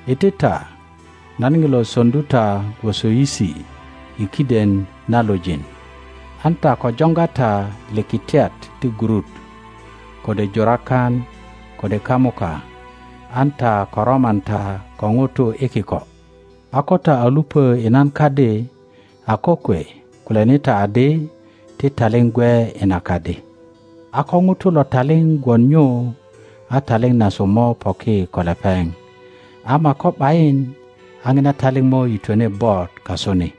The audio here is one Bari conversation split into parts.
iti ta; nan nilo soŋdu ta gwoso yisi i kiden na lujin. An ta ko jonga ta likitiat ti gurut, kode jurakan, kode kamuka; an ta ko roman ta ko nutu i kiko. A ko ta a lupo i nan kadi, a kokwe kulyani ta adi, Ti taliŋ gwe i na kadi. a ko ŋuto lo taliŋ gwon nyu a taliŋ nasu mo poki ko lepeŋ, ama ko ’bayin, a nina taliŋ mo yitwene bot kasu ni.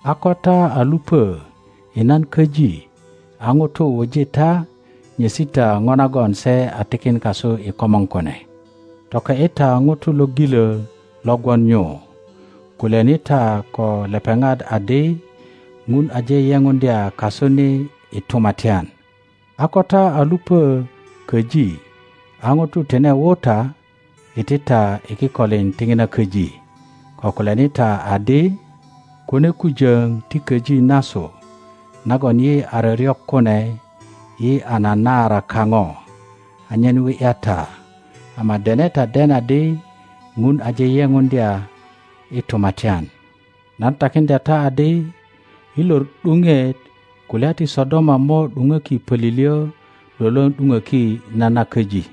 A ko ta a lupö i nan köji a nutu wuji ta, nyesi ta no nagon se a tikin kasu i komor kune. Toke ’yi ta nutu lo gilö lo gwon nyu; kulyani ta ko lepeŋat adi, Ŋun aje yepuŋdya kasu ni i tumatyan. A ko ta a lupö köji a nutu tine wu ta, iti ta i kikolin ti ŋina köji, ko kulyani ta adi, Kune kujöŋ ti köji nasu nagon yi a ryoryok kune yi a nanaara kaŋo anyen wi ’ya ta, ama dene ta den adi Ŋun aje yepuŋdya i tumatyan. Nan takiŋdya ta adi, i lor ’duŋet, kulya ti Sodoma mo ’duŋöki pölilyö lwölwöŋ ’duŋöki na na köji.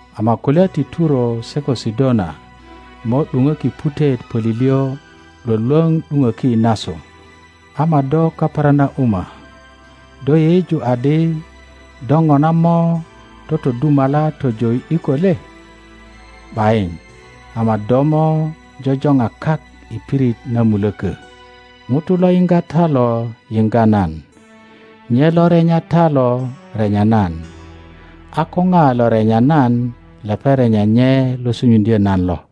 Ama kulya ti Turo se ko Sidona mo ’duŋöki putet pölilyö lwölwöŋ ’duŋöki nasu. Ama do Kaperanauma, do yeyeju adi do ŋona mo totodumala tojo i ’diko le? ’Bayin, ama do mo jojoŋa kak i pirit na mulökö. Ŋuto lo yiŋga ta lo yiŋga nan; nye lo renya ta lo renya nan; a ko ŋa lo renya nan lepeŋ renya nye lo sunyuŋdyö nan lo.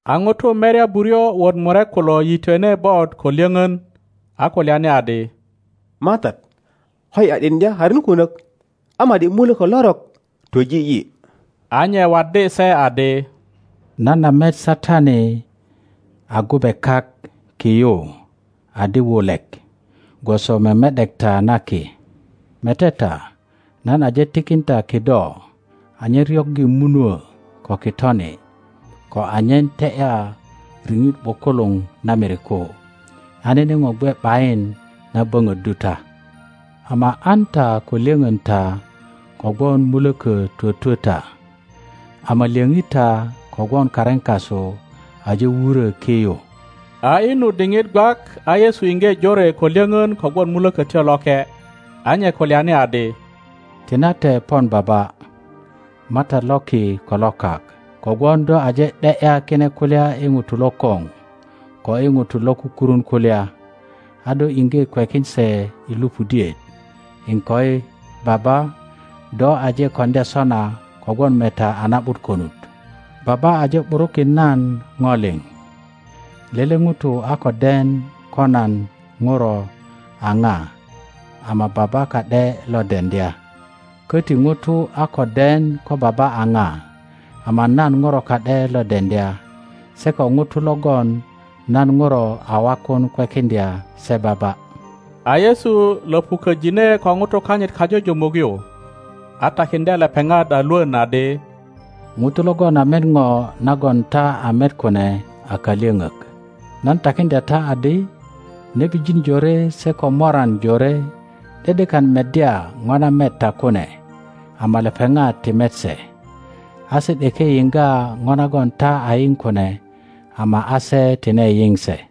A ŋutu merya buryo wot murek kulo yitwene bot ko lyöŋön, a kulyani adi, MATAT, koyi a ’diŋdya karin kunök a ma ’di mulökö lorok twöji yi. A nye waddi se adi, Nan a met Satani a gube kak ki yu adi wulek gwoso meme ’dekta na ki. Mete ta, nan aje tikin ta kido anyen ryoggi munuö ko kitoni, ko anyen te ’ya riŋit ’bukuluŋ na miriku, a nene ŋo gwe ’bayin na böŋöddu ta. Ama an ta ko lyöŋön ta kogwon mulökö twötwö ta, ama lyöŋi ta kogwon karin kasu aje wurö ki yu. A i nu diŋit gwak a Yesu iŋge jore ko lyöŋön kogwon Mulökötyo Loke, a nye kulyani adi, Tinate pon Baba, MATAT lo ki ko lo kak, kogwon do aje ’de ’ya kine kulya i ŋutu lokoŋ ko i ŋutu lo kukurun kulya, a do iŋge kwekin se i lupudiet. Iŋkoi, Baba, do aje koŋdya sona kogwon meta a na ’but konut. Baba aje ’burukin nan ŋo liŋ; lele ŋuto a ko den ko nan Ŋuro a ŋa ama Baba ka ’de lo deŋdya, köti ŋuto a ko den ko Baba a ŋa, ama nan Ŋuro ka ’de lo deŋdya, se ko ŋutu logon nan ŋuro a wakun kwekiŋdya se Baba. A Yesu löŋuköjine ko ŋutu kanyit kajujumuk yu, a takiŋdye lepeŋat a lwön adi, Ŋutu logon a met ŋo nagon ta a met kune a kalyöŋök. Nan takiŋdya ta adi, nebijin jore se ko moran jore ’de ’dekan meddya ŋo na met ta kune, ama lepeŋat ti met se, a se ’deke yiŋga ŋo nagon ta a yiŋ kune ama a se tine yiŋ se.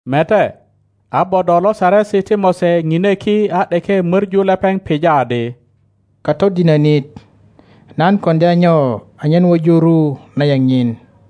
Mete, a bodo lo Saresi ti Mose ŋine ki a ’deke möŋu lepeŋ pija adi, Katodinönit, nan koŋdya nyo anyen wuju ru na yeŋ nyin?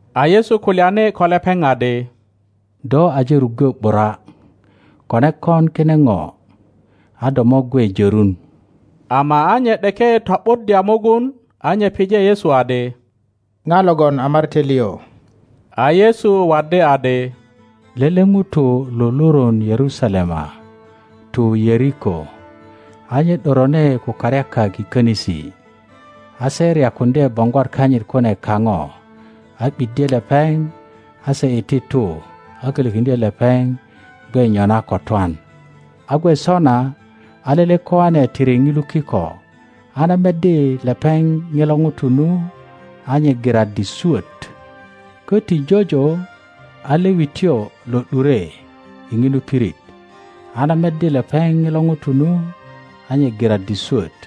A Yesu kulyani ko lepeŋ adi, Do aje ruggö ’bura, kone kon kine ŋo a do mo gwe jörun. Ama a nye ’deke to ’buddya mugun, a nye pije Yesu adi, Ŋa logon a marate liŋ? A Yesu waddi adi, Lele ŋuto lururun Yerusalema tu Yeriko, a nye ’dorone ko karyakak i könisi, a se ryakuŋdye boŋgwat kanyit kune kaŋo a ’biddye lepeŋ, a se iti tu a kolokiŋdye lepeŋ gwe nyona ko twan. A gwe sona a lele koane tiri ŋilu kiko, a na meddi lepeŋ ŋilo ŋuto nu, a nye giraddi swöt. Köti jojo a Lewityo lo ’dure i ŋinu pirit, a na meddi lepeŋ ŋilo ŋuto nu, a nye giraddi swot.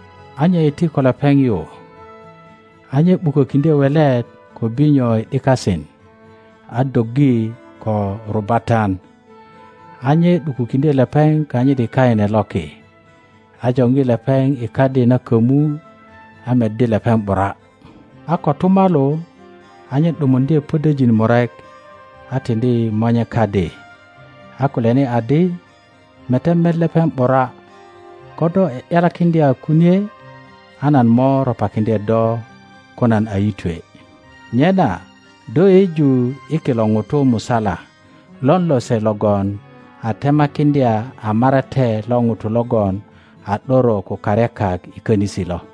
a nye iti ko lepeŋ yu, a nye ’bukokiŋdye welet ko binyo i ’dikasin a doggi ko rubatan. A nye ’dukukiŋdye lepeŋ kanyit i kaine loki, a joŋgi lepeŋ i kadi na kömu, a meddi lepeŋ ’bura. a kotumalu a nye ’dumuŋdye podojin murek a tiŋdi monye kadi, a kulyani adi, Mete met lepeŋ ’bura, ko do a ’yalakiŋdya kunie a nan mo ropakiŋdye do ko nan a yitwe. Nyena, do yeyeju i kilo ŋutu musala lon lose logon a temakiŋdya a marate lo ŋuto logon a ’doro ko karyakak i könisi lo?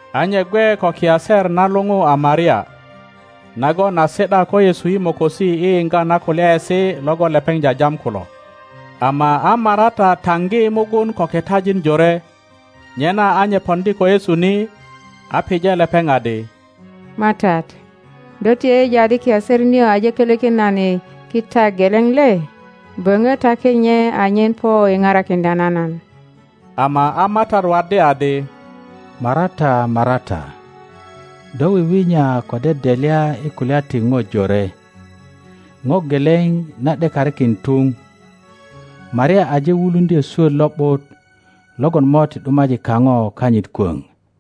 a nye gwe ko kiaser na luŋu a Maria, nagon a si ’da ko Yesu i mokosi i yiŋga na kulyaesi logon lepeŋ jajam kulo. Ama a Marata taŋgi mugun ko kitajin jore; nyena a nye poŋdi ko Yesu ni, a pije lepeŋ adi, MATAT, do ti yeyeju adi kiaser nio aje kolökin nan i kita geleŋ le? Böŋö taki nye anyen po i parakiŋdya na nan. Ama a MATAT waddi adi, Marata, Marata, do wiwinya ko dedelya i kulya ti ŋo jore. Ŋo geleŋ na ’dekarikin tuŋ. Maria aje wuluŋdyö swöt lo ’but logon mo ti ’dumaji kaŋo kanyit kwöŋ.